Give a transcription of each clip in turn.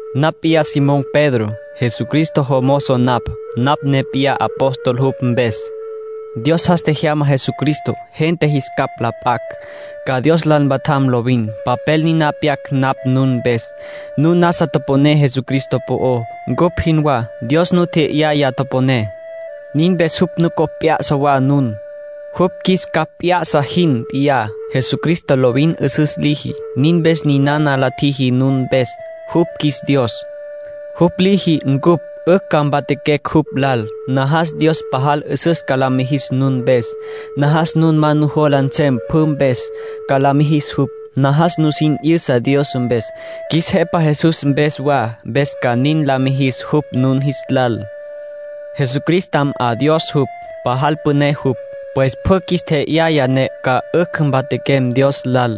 Napj p'iyá Simón Pedro, Jesucristo jomozo napj. Napj ne p'iyá apóstol jupj mpes. Dios jas tjejyama Jesucristo, gente jis capj la p'acj, ca Dios lal mpatjam lovin. Papel niná pyac napj nun mpes. Nun nasa toponé Jesucristo po'ó, ncupj jinwá. Dios nu tje'yaya toponé. Nin mpes jupj nucopj p'ya'sa wa nun, jupj qjuis capj p'ya'sa jin p'iyá. Jesucristo lovin 'üsüs liji, nin mpes ninana la tjiji nun mpes. Jupj qjuis Dios. Jupj liji cupj 'ücj ca mpatjaquecj jupj lal. Najas Dios pajal 'üsüs ca la mijis nun mpes. Najas nun ma nujola nsem pjü mpes, ca la mijis jupj. Najas nusin 'yüsa Dios mpes, qjuis Jepa Jesús mpes wa, mpes ca nin la mijis jupj nun jis lal. Jesucristam 'a Dios jupj, pajal püné jupj. Pues pjü qjuis tje'yaya ne ca 'ücj mpatjaquem Dios lal.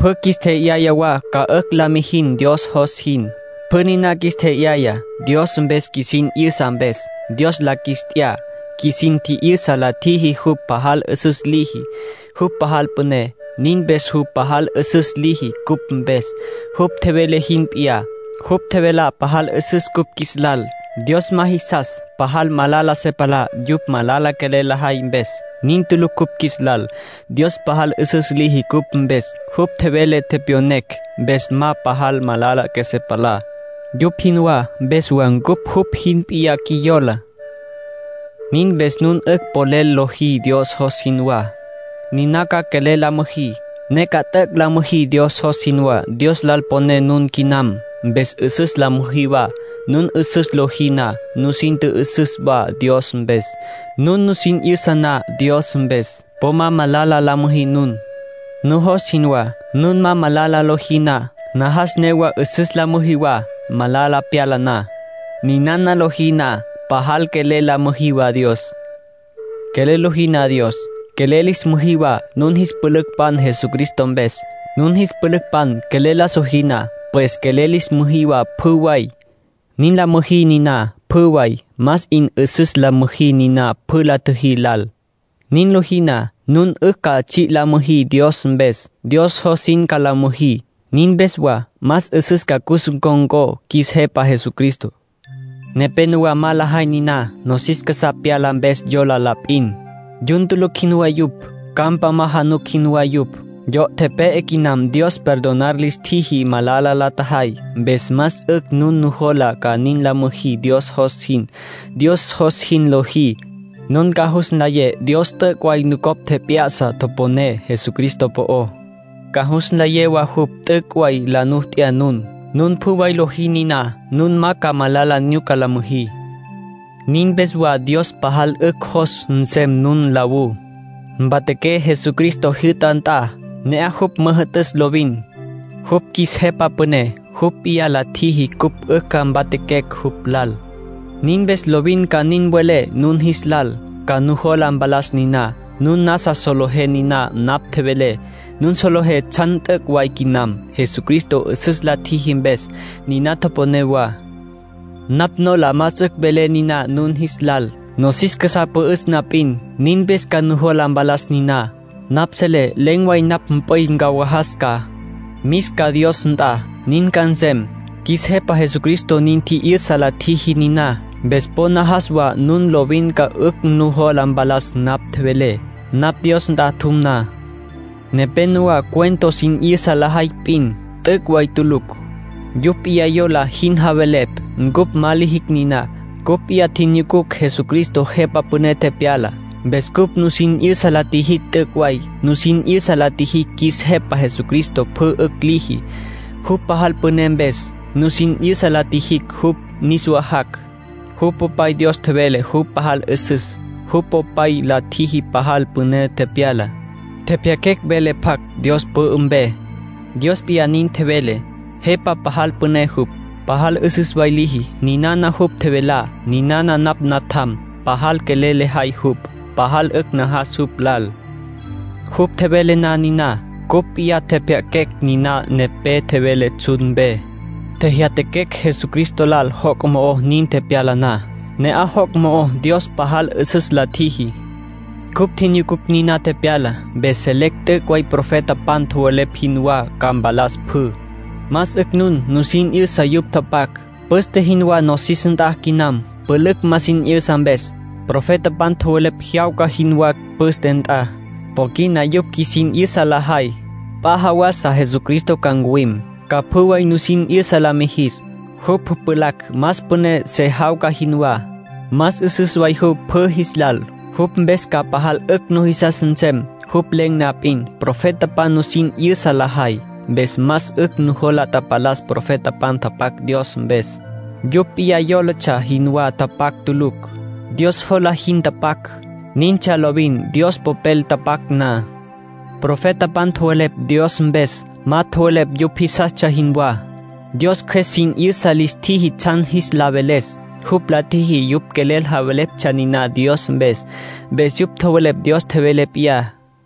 Pjü qjuis tje'yaya wa ca 'ücj la mijim Dios jos jin. Pjü niná qjuis tje'yaya, Dios mpes qjuisin 'yüsa mpes. Dios la qjuis t'ya. Qjuisin tji'yüsa la tjiji jupj pajal 'üsüs liji, jupj pajal püné. Nin mpes jupj pajal 'üsüs liji cupj mpes, jupj tjevele jin p'iyá. Jupj tjevelá pajal 'üsüs cupj qjuis lal. Dios ma jisas, pajal malala se palá, yupj malala quelel lajay mpes. Nin tulucj cupj qjuis lal. Dios pajal 'üsüs liji cupj mpes. Jupj tjevele tepyonecj, mpes ma pajal malala qjuesé palá, yupj jinwá. Mpes wa ncupj jupj jin p'iyá qjuiyola. Nin mpes nun 'ücj polel lojí Dios jos jinwá. Niná ca quelel la müjí, ne ca t'üc' la müjí Dios jos jinwá. Dios lal poné nun quinam, mpes 'üsüs la müjí wa. Nun 'üsüs lojí na, nusin tjü'üsüs wa Dios mpes. Nun nusin 'yüsa na Dios mpes, po ma malala la müjí nun, nujos jinwá. Nun ma malala lojí na, najas newa 'üsüs la müjí wa malala pyala na. Ninana lojí na, pajal quelel la müjí wa Dios. Quelel lojí na Dios, quelel lis müjí wa nun jis pülücpan Jesucristo mpes. Nun jis pülücpan quelel la sojí na, pues quelel lis müjí wa pjü way. Nin la müjí niná pjü way. Más 'in 'üsüs la müjí niná püna la tjüjí lal. Nin lojí na, nun 'ücj ca tsji' la müjí Dios mpes. Dios jos jin ca la müjí. Nin mpes wa más 'üsüs ca cus ncon̈có qjuis Jepa Jesucristo. Nepénowa ma lajay niná. Nosis casá pyala mpes yola la p'in. Yun tulucj jinwá yupj. Campa ma januc jinwá yupj. Yo' tepe'e quinam Dios perdonar lis tjiji malala la tjajay. Mpes más 'ücj nun nujola ca nin la müjí Dios jos jin. Dios jos jin lojí, nun ca jus nlayé Dios t'üc' way nucopj tjep'ya'sa toponé Jesucristo po'ó. Ca jus nlayé wa jupj t'üc' way la nu t'ya nun. Nun pjü way lojí niná, nun ma ca malala nyuca la müjí. Nin mpes wa Dios pajal 'ücj jos nsem nun nlawú, mpatjaqué Jesucristo jyü'ta nt'a. Ne'aj jupj müjü'tüs lovin. Jupj qjuis Jepa Püné. Jupj p'iyá la tjiji cupj 'ücj ca mpatjaquecj jupj lal. Nin mpes lovin ca nin mvelé nun jis lal, ca nujola mpalas niná. Nun nasa solejé niná napj tjevelé. Nun solejé tsjan t'üc' way quinam, Jesucristo 'üsüs la tjiji mpes. Niná toponé wa. Napj nola más 'ücj velé niná nun jis lal, nosis casá pü'üs na p'in. Nin mpes ca nujola mpalas niná. Napj selé len̈ way napj mp'üy ncawajas ca. Mis ca Dios nt'a. Nin ca nsem; qjuis Jepa Jesucristo nin tji'yüsa la tjiji niná. Mpes po najas wa nun lovin ca 'ücj nujola mpalas napj tjevelé, napj Dios nt'a tjum na. Nepénowa cuento sin 'yüsa lajay p'in, t'üc' way tulucj. Yupj p'iyá yola jin javelepj. Ncupj ma lijicj niná. Cupj p'iyá tjinyucucj Jesucristo Jepa Püné tepyala. Mpes cupj nusin 'yüsa la tjijicj t'üc' way. Nusin 'yüsa la tjijicj qjuis Jepa Jesucristo pjü 'ücj liji, jupj pajal püné mpes. Nusin 'yüsa la tjijicj jupj niswa jac'. Jupj Popay Dios tjevele jupj pajal 'üsüs. Jupj Popay la tjiji pajal püné tepyala. Tjepjya'aquecj vele pjac Dios pü'ü mpe. Dios p'iyá nin tjevele. Jepa pajal püné jupj. Pajal 'üsüs way liji. Ninana jupj tjevelá: “Ninana napj Natjam. Pajal quelel lejay jupj. Pajal 'ücj najas jupj lal.” Jupj tjevele na niná, cupj p'iyá tjepjya'aquecj niná nepé tjevele tsjun mpe. Tjejyatjaquecj Jesucristo lal joc' mo'ó nin tepyala na. Ne'aj joc' mo'ó Dios pajal 'üsüs la tjiji. Cupj tjinyucucj niná tepyalá, mpes selecj t'üc' way profetapan tjowelepj jinwá ca mpalas pjü. Más 'ücj nun nusin 'yüsa yupj tapac. Püste jinwá nosis nt'a quinam, pülücj ma sin 'yüsa mpes. Profetapan tjowelepj jyawca jinwá püste nt'a. Po quina yupj qjuisin 'yüsa lajay. P'a jawasa Jesucristo ca ncuwim, ca pjü way nusin 'yüsa la mijis. Jupj pjulacj más püné se jawca jinwá. Más 'üsüs way jupj pjü jis lal. Jupj mpes ca pajal 'ücj nujisas nsem. Jupj len̈ na p'in, profetapan nusin 'yüsa lajay. Mpes más 'ücj nujola tapalas profetapan tapac Dios mpes; yupj p'iyá yólatsja jinwá tapac tulucj. Dios jola jin tapac. Nintsja lovin Dios Popel tapac na. Profetapan tjowelepj Dios mpes; ma tjowelepj yupj jisastsja jinwá. Dios Cjües sin 'yüsa lis tjiji tsjan jis la veles. Jupj la tjiji yupj quelel javeleptsja niná Dios mpes. Mpes yupj tjowelepj Dios tjevele p'iyá.